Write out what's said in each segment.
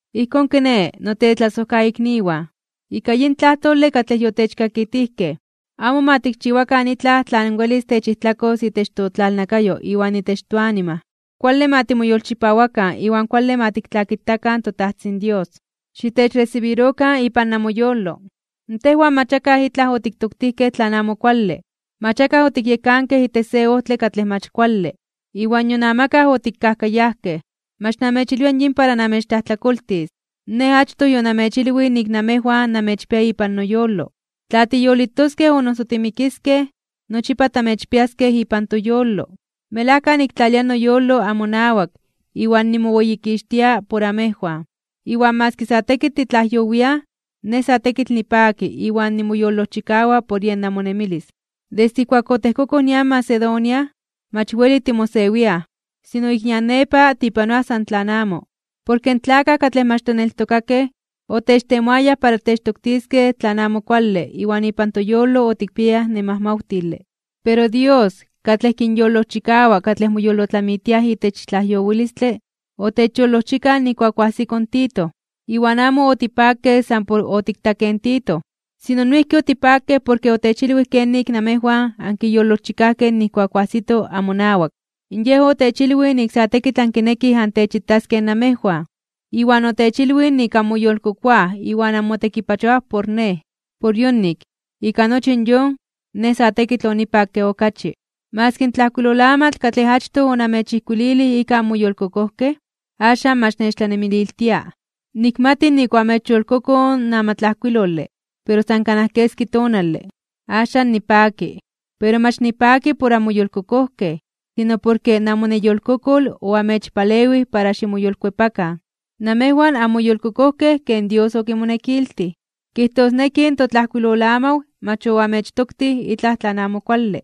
Ijkón kiné, notetlasojkaikniwan, ika yin tlajtole katlej yotechkakitijkej, amo ma tikchiwakan itlaj tlan welis techijtlakos itech totlalnakayo iwan itech toanima. Kuale ma timoyolchipawakan iwan kuale ma tiktlakitakan in toTajtzin Dios. Xitechresibirokan ipan namoyolo. Tejwan mach akaj itlaj otiktoktijkej tlan amo kuale, mach akaj otikyekankej itech se ojtle katlej mach kuale, iwan nion amakaj otikajkayajkej. Mach namechilwia yin para namechtlajtlakoltis. Nej achtoj yonamechilwij nik namejwan namechpia ipan noyolo. Tla tiyolitoskej o noso timikiskej, nochipa tamechpiaskej ipan toyolo. Melajka niktlalia noyolo amonawak iwan nimoweyikixtia por amejwan. Maski sa tekitl titlajyowiaj, nej sa tekitl nipaki iwan nimoyolojchikawa por yen namonemilis. Desde ijkuak otejkokoj nian Macedonia, mach weli timosewiaj, sino ik nian nepa tipanoaj san tlan amo, porke in tlakaj katlej mach tlaneltokakej otechtemoayaj para techtoktiskej tlan amo kuale iwan ipan toyolo otikpiayaj nemajmawtile. Pero Dios, katlej kinyolojchikawa katlej moyolotlamitiaj itech tlajyowilistle, otechyolojchikaj nijkuak oajsiko in Tito. Iwan amo otipakej san por otiktakej in Tito, sino noijki otipakej porke otechilwij kenik namejwan ankiyolojchikajkej nijkuak oajsito amonawak. Yej otechilwij nik sa tekitl ankinekij antechitaskej namejwan, iwan otechilwij nik anmoyolkokoaj iwan anmotekipachoaj por nej. Por yonik, ika nochi yon, nej sa tekitl onipakke okachi. Maski in tlajkuilolamatl katlej achtoj onamechijkuililij ika anmoyolkokojkej, axan mach nechtlanemililtia. Nikmati nik oamechyolkokoj in amatlajkuilole, pero san kanaj keski tonale. Axan nipaki. Pero mach nipaki por anmoyolkokojkej, sino porke namoneyolkokol oamechpalewij para ximoyolkuepakan. Namejwan anmoyolkokojkej ken Dios okimonekiltij, kijtosneki in totlajkuilolamaw mach oanmechtoktij itlaj tlan amo kuale.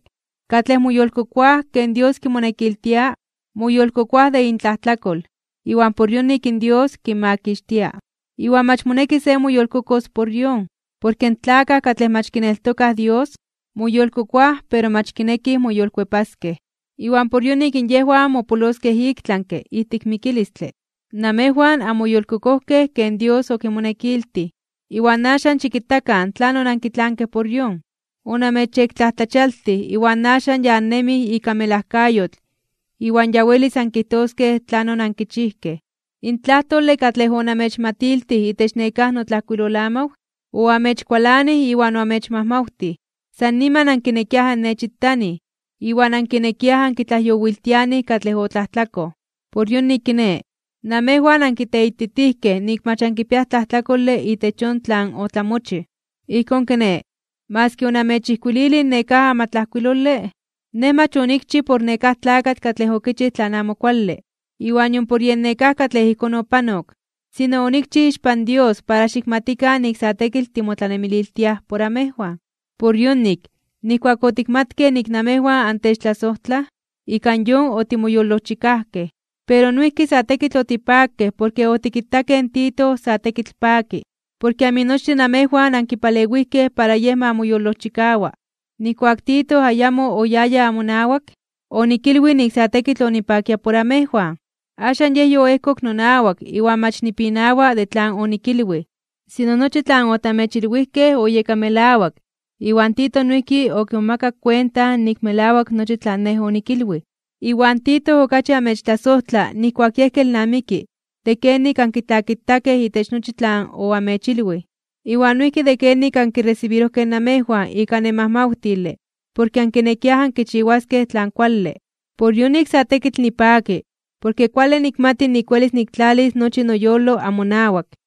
Katlej moyolkokoaj ken Dios kimonekiltia, moyolkokoaj de intlajtlakol, iwan por yonik Dios kinmakixtia, iwan mach moneki se moyolkokos por yon. Porke in tlakaj katlej mach kineltokaj Dios, moyolkokoaj pero mach kinekij moyolkuepaskej, iwan por yonik yejwan mopoloskej iktlanke (ik tlami) ijtik mikilistle. Namejwan oanmoyolkokojkej ken Dios okimonekiltij, iwan axan xikitakan tlanon ankitlankej por yon. Onamechyektlajtlachialtij iwan axan ya annemij ika melajkayotl iwan ya welis ankijtoskej tlanon oankichijkej. In tlajtlakole katlej onamechmatiltij itech nekáj notlajkuilolamaw, oamechkualanij iwan oamechmajmawtij. San niman ankinekiaj annechitanij, iwan ankinekiaj ankitlajyowiltianij katlej otlajtlakoj. Por yonik kiné, namejwan ankiteititijkej nik mach ankipiaj tlajtlakole itech yon tlan otlamochij. Ijkón kiné, maski onamechijkuililij nekáj amatlajkuilole, nej mach onikchij por nekáj tlakatl katlej okichij tlan amo kuale, iwan nion por yen nekáj katlej ijkón opanok, sino onikchij ixpan Dios para xikmatikan nik sa tekitl timotlanemililtiaj por amejwan. Por yonik, nijkuak otikmatkej nik namejwan antechtlasojtlaj, ika yon otimoyolojchikajkej. Pero noijki sa tekitl otipakej porke otikitakej in Tito sa tekitl paki, porke aminochtin namejwan ankipalewijkej para yej ma moyolojchikawa. Nijkuak Tito ayamo oyaya amonawak, onikilwij nik sa tekitl onipakia por amejwan. Axan yej yoejkok nonawak iwan mach nipinawa de tlan onikilwij. Sino nochi tlan otamechilwijkej oyeka melawak, iwan Tito noijki okimomakak kuenta nik melawak nochi tlan nej onikilwij. Iwan Tito okachi amechtlasojtla nijkuak yej kelnamiki de kenik ankitlakitakej itech nochi tlan oamechilwij. Iwan noijki de kenik ankiresibirojkej namejwan ika nemajmawtile porke ankinekiaj ankichiwaskej tlan kuale. Por yonik sa tekitl nipaki porke kuale nikmati nik welis niktlalis nochi noyolo amonawak.